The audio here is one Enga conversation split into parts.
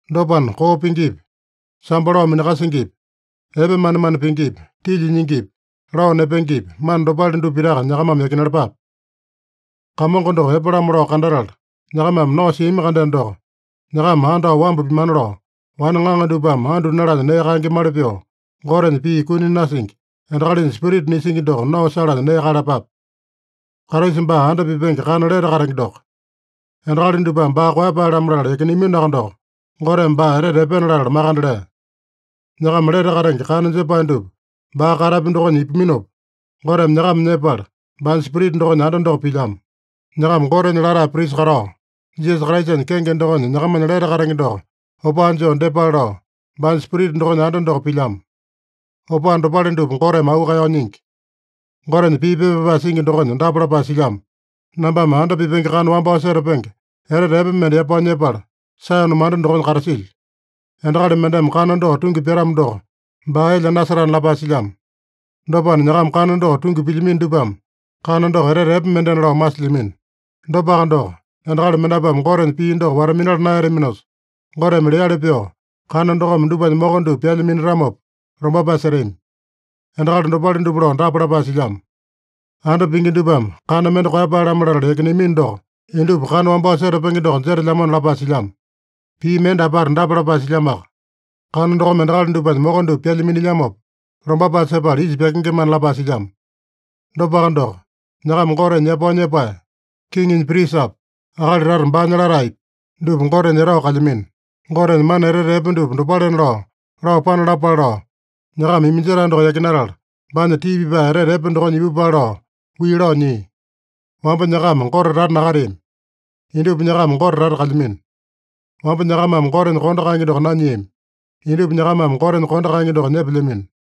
Dopana, koo pingipi, sambo lao minakasingipi, epe manemane pingipi, tilya nyingipi, lao nepengepi, mana dopale dupa pitaka nyakamame yakinalapape. Kamongo doko epe-lamo lao kandatala, nyakamame nao siami-kandeno doko, nyakama andao wambu pimana lao, wane ŋaŋa dupame andu nalanya nee kaengemali pyoo, Gotenya pii kuni nasingi, endakalinya spirita nisingi doko nao salanya nee kaeyalapape. Kraisa baa anda pipenge kana lete katenge doko. Endakali dupame baa koeyapae-lamo latala yakineaminoaka doko, Goteme baa etete epena latala makande lea. Nyakama lete katenge kana jepae dupa baa katapya dokonya ipuminopa, Goteme nyakama nyepala, baanya Spirita dokonya anda doko pilyamo. Nyakama Gotenya latae prisa katao, Jisasa Kraisanya kenge dokonya nyakamanya lete katenge doko opaa joo dyepale lao, baanya Spirita dokonya anda doko pilyamo. Opaa dopale dupa Goteme auu kaeyao nyingi. Gotenya pii pepa pyapae singi dokonya dapa lapae silyamo: “Nambame anda pipenge kana wambao setapenge, etete epe mende yapao nyepala, Saeyone manda dokonya katasilyo. Endakali mendeme kana doko tungi pyatamo doko, baa elya nasetana” lapae silyamo. Dopana, nyakama kana doko tungi pilyamino dupame kana doko etete epe mendena lao masilyamino. Dopaka doko, endakali mendapuame Gotenya pii doko wata-minala naeyataminosa, Goteme leali pyoo kana dokome dupanya moko dupa pyalya minatamopa, lombapae setami. Endakali dopale dupa lao dapa lapae silyamo: “Anda pingi dupame kana mende koeyapae-lamo latala yakineamino doko, indupa kana wambao setapenge doko jetelyamona” lapae silyamo. Pii mende apata dapa lapae silyamoaka: “Kana dokome endakali dupanya moko dupa pyalya minilyamopa, lombapae sepala isa pyakengemana” lapae silyamo. Dopaka doko, nyakama Gotenya yapao nyepae, kiŋinya prisapi, akali tata baanya lataepi, dupa Gotenya etao kalyamino. Gotenya mana etete epe dupa dopalena lao, lao panalapale lao, nyakama iminjetae doko yakinatala, baanya tii pipae etete epe dokonya ipupale lao wii lao nyia. Wamba nyakama Gote tata nakateami. Indupa nyakama Gote tata kalyamino. Wamba nyakamame Gotenya kondo kaenge doko nanyiami. Indupa nyakamame Gotenya kondo kaenge doko nyepelyamino.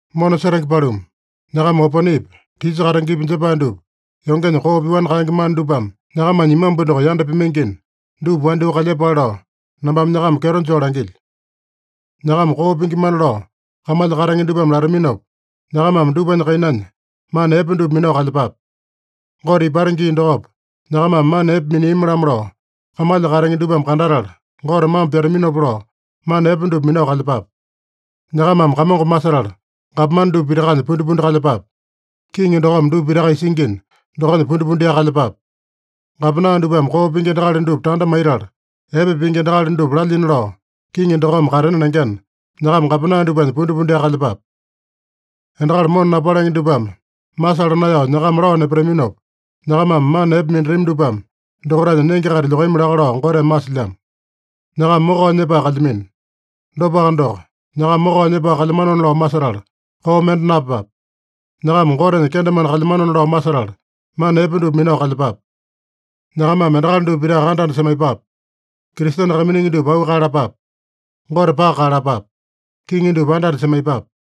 Mona setenge paluma, nyakama oponepi, tisa katengepi jepae dupa yongenya koo pyoani kaenge mana dupame nyakamanya imambu doko yanda pimaingina, dupa wandyoo kalyepale lao nambame nyakama kyeto joo langilyo. Nyakama koo pingimana lao kamalya katenge dupame lataminopa, nyakamame dupanya kainanya mana epe dupa minao kalyepape. Gote ipata gii dokopa, nyakamame mana epe miniami-lamo lao kamalya katenge dupame kandatala, Gote mambo pyataminopa lao, mana epe dupa minao kalyepape. Nyakamame Kamongo masetala, gapomane dupa pitakanya pundipundi kalyepape. Kiŋi dokome dupa pitaka isingina, dokonya pundipundiaka kalyepape. Gapena dupame koo pingi endakali dupa tanda maitala, epe pingi endakali dupa lalyina lao, kiŋi dokome katena lengena, nyakama gapena dupanya pundipundiaka kalyepape. Endakali mona napalenge dupame masala naeyao nyakama lao nepataminopa, nyakamame mana epe minatami dupame dokaitanya nenge-kaita lyokami laka lao Goteme masilyamo. Nyakama mokao nyepae kalyamino. Dopaka doko, nyakama mokao nyepae kalyamanona lao masetala, koo mende napyepape. Nyakama Gotenya kendemane kalyamanona lao masetala, mana epe dupa minao kalyepape. Nyakamame endakali dupa pitaka anda-anda semaiyepape. Kristene kaiminingi dupa auu kaeyalapape. Gote paka kaeyalapape. Kiŋi dupa anda-anda semaiyepape.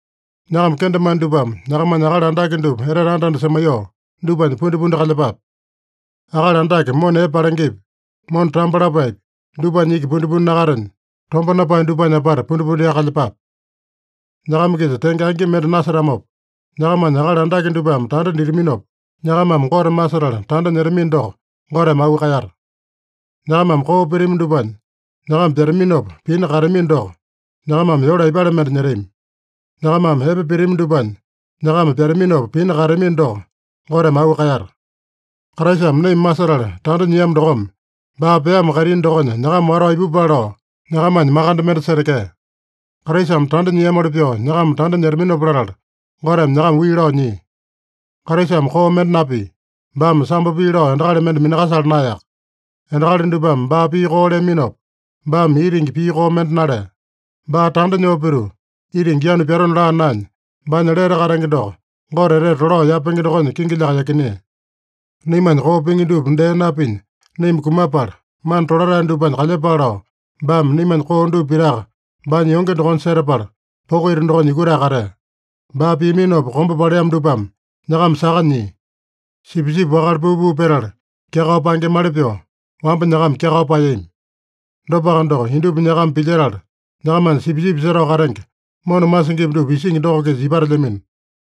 Nyakama kendemane dupame nyakamanya akali andake dupa etete anda-anda semaiyoo, dupanya pundipundi kalyepape. Akali andake mona epe palengepi, mona tambo lapaepi, dupanya iki pundipundi nakatenya, tomba napae dupanya apata pundipundiaka kalyepape. Nyakama-kisa tenge angi mende nasetamopa, nyakamanya akali andake dupame tanda ditaminopa, nyakamame Gote masetala tanda nyetamino doko, Goteme auu kaeyata. Nyakamame koo pitami dupanya nyakama pyataminopa pina kaeyatamino doko, nyakamame yole aipale mende nyetami? Nyakamame epe pitami dupanya nyakama pyataminopa pina kaeyatamino doko, Goteme auu kaeyata. Kraisame naima masetala tanda nyiamo dokome, baa peamo kaitini dokonya nyakama watao ipupale lao, nyakamanya makande mende setekea. Kraisame tanda nyiamoli pyoo nyakama tanda nyetaminopa latala, Goteme nyakama wii lao nyia. Kraisame koo mende napia. Baame sambo pii lao endakali mende minakasala naeyaka. Endakali dupame baa pii koo leaminopa, baame itingi pii koo mende nalea. Baa tanda nyoo pituu itingi yanu pyatona laa naenya, baanya lete katenge doko Gote etete tolao yapenge dokonya kingilyaka yakinea. Naimanya koo pingi dupa dee napinya naima kumapala, mana tolatae dupanya kalyepale lao, baame naimanya koo dupa pitaka baanya yonge dokonya setapala, poko ita dokonya yukutae katea. Baa piaminopa kombe paleamo dupame nyakama saka nyia. Sipisipi wakale puu-puu petala kyakao paengemali pyoo, wamba nyakama kyakao paeyami. Dopaka doko, indupa nyakama pilyetala nyakamanya Sipisipi Setao Katenge, mona masingipi dupa isingi doko-kisa ipatelyamino.